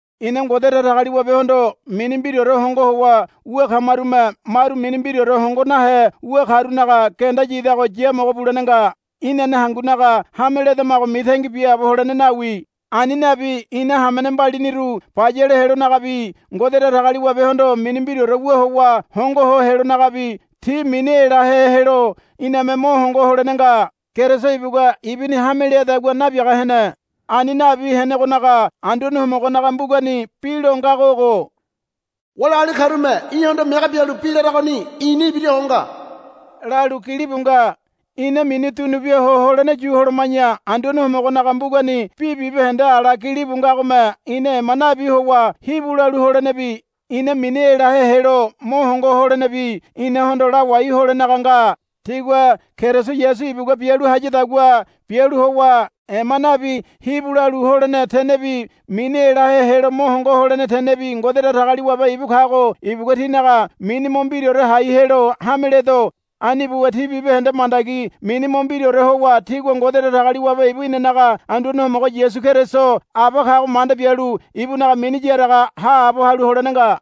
Ina Ngode Datagaliwabehondo mini mbiraore hongo howa wu kamarume maru mini mbiraore hongo nahe wu karunaga genda yidago yamogo bulene nga. Inane hangunaga hame ledamago mitangi biaabo holene nawi. Ani nabi ina hamene mbaliniru bayale helonagabi Ngode Datagaliwabehondo mini mbiraore wu howa hongo ho helonagabi ti mini elahe helo iname mo hongo holene nga. Keriso ibugua ibuni hame leadagua nabiaga hene. Ani nabi henegonaga Anduane Homogonaga mbugani bi lo ngago ogo, Wali agali karume í̠hondo mege bialu bi laragoni i̱ni ibira ho nga, lalu gilibu nga. Ina mini dunubia ho holene yu holoma̱ya Anduane Homogonaga mbugani bi bibahende ala gilibu ngagome ina ema nabi howa hibu lalu holenebi ina mini elahe helo mo hongo holenebi inahondo lawai holenaga nga. Tígua Keriso Yasu ibugua bialu hayadagua bialu howa ema nabi hibu lalu holene tenebi mini elahe helo mo hongo holene tenebi Ngode Datagaliwabe ibu kago ibugua tínaga mini mo mbiraore hai helo hameledo. Ani buwa tí bibahende mandagi mini mo mbiraore howa tígua Ngode Datagaliwabe ibu inanaga Anduane Homogo Yasu Keriso Aba kago manda bialu ibunaga mini yaraga haabo halu holene nga.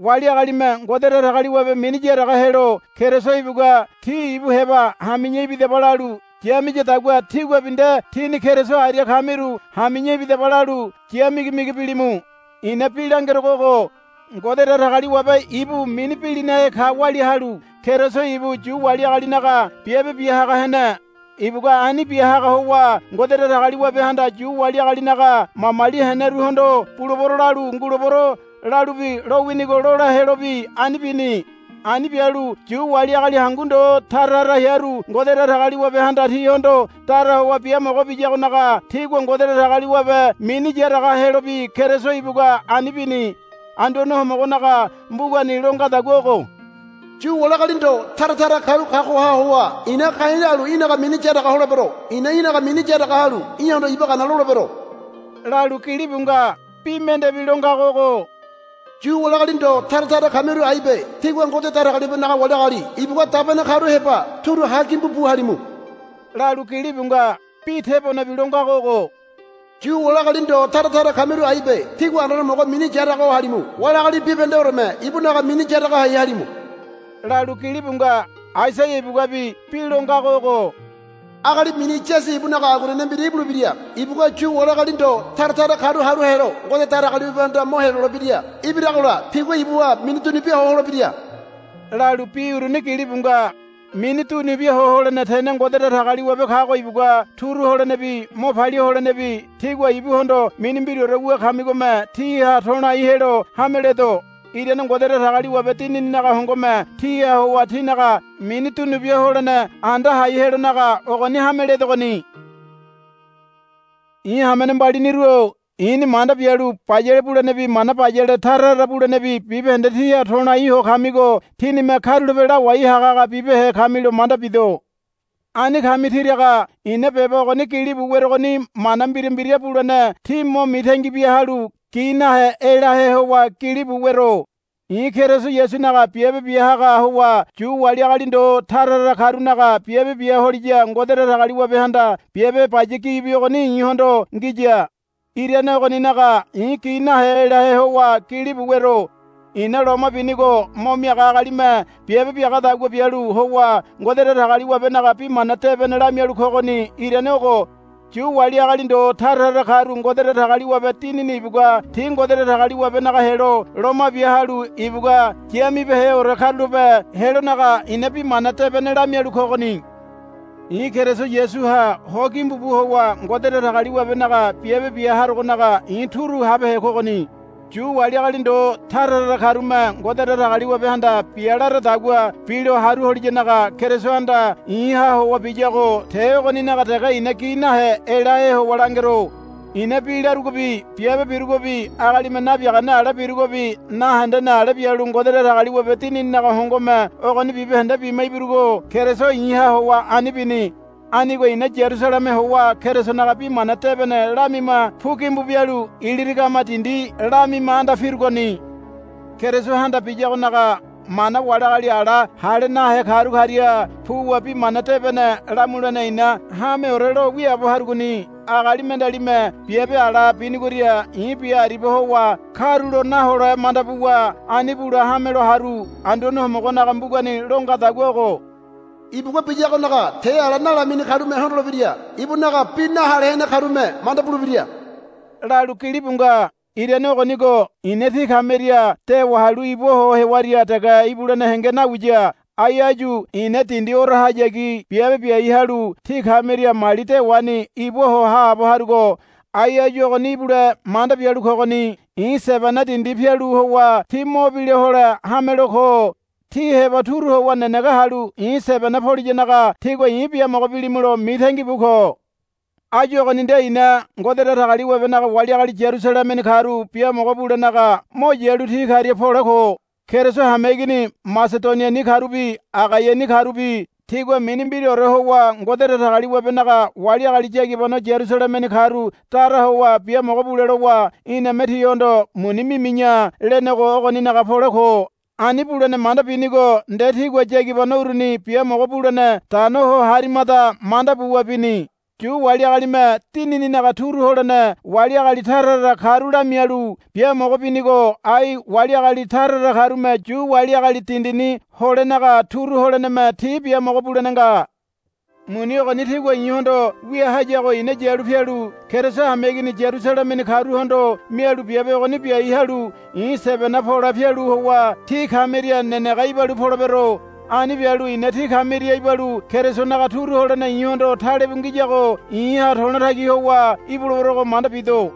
Wali agalime Ngode Datagaliwabe mini yaraga helo Keriso ibugua tí ibu heba hami̱ya ibidaba lalu yamiyadagua tíguabi nde tíni Keriso aria kamiru hami̱ya ibidaba lalu ya migimigi bilimu. I̱na bi langerogo ogo. Ngode Datagaliwabe ibu mini bilinahe ka walia halu Keriso ibu Yu wali agalinaga biabe bia haga hene. Ibugua ani bia haga howa Ngode Datagaliwabehanda Yu wali agalinaga mamali heneruhondo, Bulebero, lalu, Ngulebero, lalu bi lowinigo lola helobi ani bini. Ani bialu Yu wali agali hangu ndo tara tara hearu Ngode Datagaliwabehanda tihondo dara howa biamogo biyagonaga tigua Ngode Datagaliwabe mini yaraga helobi Keriso ibugua ani bini. Anduane Homogonaga mbugani lo ngadagua ogo. Yu wali agali ndo tara tara karu kagoha howa i̱na ka̱i̱ lalu í̠naga mini yaraga holebero. I̱na í̠naga mini yaraga halu í̠hondo iba gana lolebero, lalu gilibu nga. Bi mendebi lo ngago ogo, Yu wali agali ndo tara tara kamiru aibe. Tígua Ngode Datagaliwabenaga wali agali ibugua dabene karu heba turu ha gimbu bu halimu, lalu gilibu nga. Bi tebonebi lo ngago ogo, Yu wali agali ndo tara tara kamiru aibe. Tígua Anduane Homogo mini yaraga ho halimu. Wali agali bibahendeoreme ibunaga mini yaraga hai halimu, lalu gilibu nga. Aisaia ibuguabi bi lo ngago ogo, Agali mini Yasi ibunaga aguanene mbira ibulebira. Ibugua Yu wali agali ndo tara tara karu haru helo Ngode Datagaliwabehanda mo helolebira. Ibiragola tigua ibuha mini dunubia ho holebira, lalu bi uruni gilibu nga. Mini dunubia ho holene tene Ngode Datagaliwabe kago ibugua turu holenebi mo palia holenebi tígua ibuhondo mini mbiraore wu kamigome tíha to̱lai helo hameledo. Irane Ngode Datagaliwabe Dinininaga hongome tíha howa tínaga mini dunubia ho holene anda hai helonaga ogoni hame ledogoni. I̱ hamene mbaliniru-o i̱ni manda bialu bayale bulenebi mana bayale tara tara bulenebi bibahende tíha to̱lai ho kamigo tínime karulape lawai hagahaga bibehe kamilo manda bido. Ani kami tiraga i̱na beba ogoni gilibu werogoni mana mbira mbira bulene tí mo mitangi bia halu gi nahe elahe howa gilibu wero. I̱ Keriso Yasunaga biabe bia haga howa Yu wali agali ndo tara tara karunaga biabe bia holiya Ngode Datagaliwabehanda biabe baya gibi ogoni i̱hondo ngiya. Irane ogoninaga i̱ gi nahe elahe howa gilibu wero. I̱na loma binigo mo miaga agalime biabe biagadagua bialu howa Ngode Datagaliwabenaga Bi Mana Debene lamialu kogoni irane ogo. Yu wali agali ndo tara tara karu Ngode Datagaliwabe Dinini ibugua ti Ngode Datagaliwabenaga helo loma bia halu ibugua yamibeheore karulape helonaga i̱na Bi Mana Debene lamialu kogoni. I̱ Keriso Yasuha ho gimbu bu howa Ngode Datagaliwabenaga biabe bia harogonaga i̱ turu habehe kogoni. Yu wali agali ndo tara tara karume Ngode Datagaliwabehanda bia laradagua bilo haru holiyanaga Kerisohanda i̱ha howa biyago te ogoninaga dege i̱na gi nahe elahe howa langero. I̱na bi larugobi biabe birugobi agalime nabiagane ale birugobi nahendene ale bialu Ngode Datagaliwabe Dinininaga hongome ogoni bibahende bima ibirugo Keriso i̱ha howa ani bini. Anigo i̱na Yarusaleme howa Kerisonaga Bi Mana Debene lamima pu gimbu bialu Ilirigama dindi lamima anda pirugoni. Kerisohanda biyagonaga mana wali agali ala hale nahe karu karia puwa Bi Mana Debene lamulene i̱na hameore lo wiaabo harugoni. Agali mendealime biabe ala binigoria i̱ bia aribia howa karulo nahole manda buwa ani bule hamelo haru. Anduane Homogonaga mbugani lo ngadagua ogo, Ibugua biyagonaga te ala nalamini karume hondolebira. Ibunaga bi nahale hene karume manda bulebira, lalu gilibu nga. Irane ogonigo i̱na tí kamiria dewa halu ibua ho hewaria dege ibulene henge nawiya. Ai áyu i̱na dindi orahayagi biabe biai halu tí kamiria mali dewani ibua ho haabo harugo ai áyu ogoni ibule manda bialu kogoni. I̱ Sebena dindi pialu howa tí mo bila hole hamelo ko. Tí heba turu howa nenege halu i̱ Sebena poliyanaga tígua i̱ biamogo bilimulo mitangi bu ko. Áyu ogoni nde i̱na Ngode Datagaliwabenaga wali agali Yarusalemeni karu biamogo bulenaga mo yalu ti karia pole ko. Keriso hameigini Masedoniani karubi Agaiani karubi tigua mini mbiraore howa Ngode Datagaliwabenaga wali agali yagibano Yarusalemeni karu dara howa biamogo bule lowa, Iname tihondo muni mimi̱ya, lenego ogoninaga pole ko. Ani bulene manda binigo nde tigua yagibano uruni biamogo bulene dano ho harimada manda buwa bini. Yu wali agalime dinininaga turu holene wali agali tara tara karu lamialu biamogo binigo ai wali agali tara tara karume Yu wali agali dindini holenaga turu holeneme ti biamogo bulene nga. Muni ogoni tigua i̱hondo wia hayago i̱na yalu pialu Keriso hameigini Yarusalemeni karuhondo mialu biabe ogoni biai halu i̱ Sebena pole pialu howa tí kamiria nenege ibalu polebero. Ani bialu i̱na tí kamiria ibalu Kerisonaga turu holene i̱hondo talebu ngiyago i̱ha to̱lotagi howa ibuleberogo manda bido.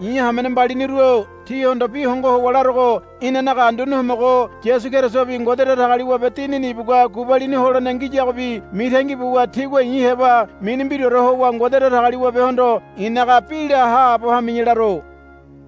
I̱ hamene mbaliniru-o tíhondo bi hongo howa larogo inanaga Anduane Homogo Yasu Kerisobi Ngode Datagaliwabe Dinini ibugua gubalini holene ngiyagobi mitangi buwa tígua i̱ heba mini mbiraore howa Ngode Datagaliwabehondo i̱naga bi la haabo hami̱ya laro.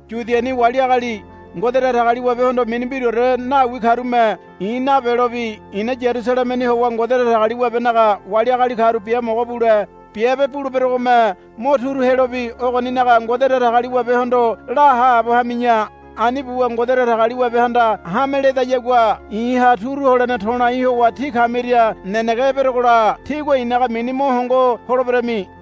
Yudiani wali agali Ngode Datagaliwabehondo mini mbiraore nawi karume i̱ nabelobi i̱na Yarusalemeni howa Ngode Datagaliwabenaga wali agali karu biamogo bule biabe buleberogome mo turu helobi ogoninaga Ngode Datagaliwabehondo la haabo hami̱ya. Ani buwa Ngode Datagaliwabehanda hame ledayagua i̱ha turu holene to̱lai howa tí kamiria nenege eberogola tígua i̱naga mini mo hongo holeberami.